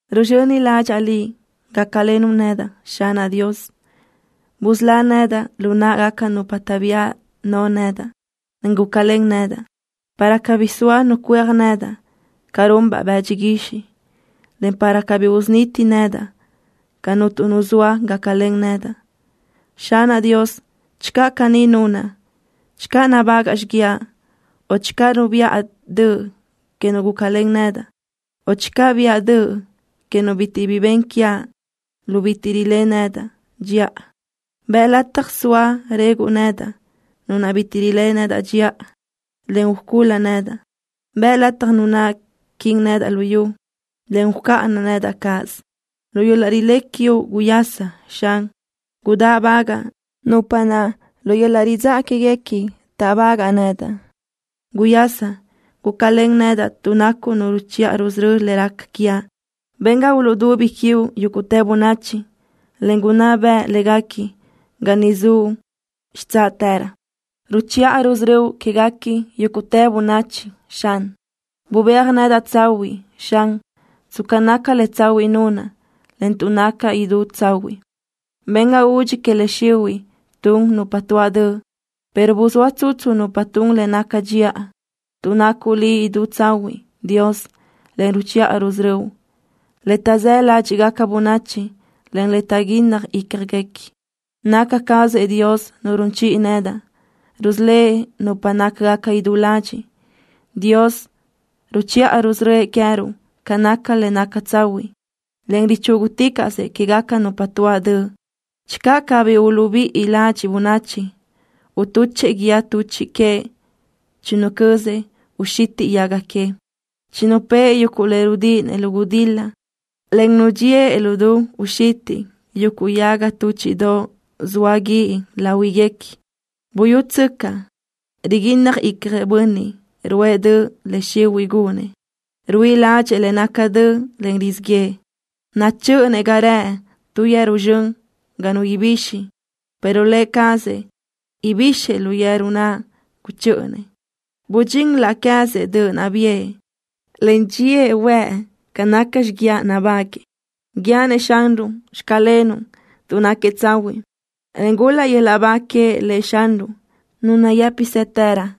Ruzxöni ládxaʼa Liʼ, gácalenuʼ nedaʼ, Xanaʼ Dios. Busölá nedaʼ lu náʼagaca nupa taʼbía no nedaʼ, en gúcalen nedaʼ para cabí soa nu cuéaj nedaʼ ca runbaʼ bëdxi guixiʼ, en para cabí usuniti nedaʼ ga cuntu nu zoa gácalen nedaʼ. Xanaʼ Dios, channö caní nunaʼ: Channö nabágaʼa xiguiaʼ, o channö bubiʼa döʼ que nu gúcalen nedaʼ, o channö biʼa döʼ que nu bitiʼ bi ben quiaʼ lu bitiʼ riléʼe nedaʼ dxiʼa, bëʼ lataj soa reguʼ nedaʼ nu naʼ bitiʼ riléʼe nedaʼ dxiʼa, en ucul-la nedaʼ. Bëʼ lataj nu naʼ quin nedaʼ lu yu, en ucáʼana nedaʼ cáʼasö. Lu yöl-laʼ rilé quiuʼ guyasa, Xan. Gudáʼbagaʼ nupa naʼ lu yöl-laʼ ridzáʼa quéguequi táʼbagaʼ nedaʼ. Guyasa, gúcalen nedaʼ tuʼ nacuʼ Nu ruchiʼa rusörö́ le raca quiaʼ. Ben ga uluʼdubi quiuʼ yúguʼtë bönachi, en gunná beʼe léguequi ga niʼ zuʼ xitsáʼtërö. Ruchiʼa rusörö́uʼ quéguequi yúguʼtë bönachi, Xan. Bubéaj nedaʼ tsahuiʼ, Xan, tsca naca le tsahuiʼ nunaʼ, en tuʼ nacaʼ idú tsahuiʼ. Ben ga udxi que le xihuiʼ tun nupa tuáʼ döʼ, pero buzóa tsutsu nupa tun le naca dxiʼa, tuʼ nacuʼ Liʼ idú tsahuiʼ, Dios, en ruchiʼa rusörö́uʼ le taʼzáʼ ládxiʼgaca bönachi, en le taʼguínnaj ícjaguequi. Naca cazëʼ Dios Nu run chiʼi nedaʼ. Rusölë́ʼ nupa nácagaca idú ladxiʼ. Dios ruchiʼa rusörö́ëʼ queëruʼ ca naca le naca tsahuiʼ, en richúguticaʼsëʼ quégaca nupa tuáʼ döʼ. Channö cabí uluʼbíʼi ladxiʼ bönachi, utuchëʼ guíë tuchiʼ queëʼ. Chinucözëʼ uxitiʼ yaga queëʼ. Chinupë́ʼë yuguʼ le rudíʼinëʼ lu gudil-la, en nudxíëʼ lu du uxitiʼ yuguʼ yaga túchiʼdoʼ zoa guíʼ láhuiguequi. Buyútsöcaʼ, riguínnaj icjëʼ bönniʼ ruʼë döʼ le xihuiʼ gunëʼ. Ruíʼi ládxëʼë le naca döʼ, en rizíʼ yëʼë. Nachö́ʼönëʼ ga rëʼ tu yeru zxön ga nu ibixi, pero lë cazëʼ yöjbixëʼ lu yeru naʼ guchö́ʼönëʼ. Budxín laʼ queë́zëʼ döʼ naʼ biʼë, en dxíëʼ huëʼ ca naca xiguiaʼ nabáguëʼë. Guíaʼ-nëʼ Xanruʼ: “Xclenuʼ” tuʼ náquiëʼ tsahuiʼ, en gul-laʼ yöl-laʼ ba que Lëʼ Xanruʼ, Nu nayë́pisëtërö.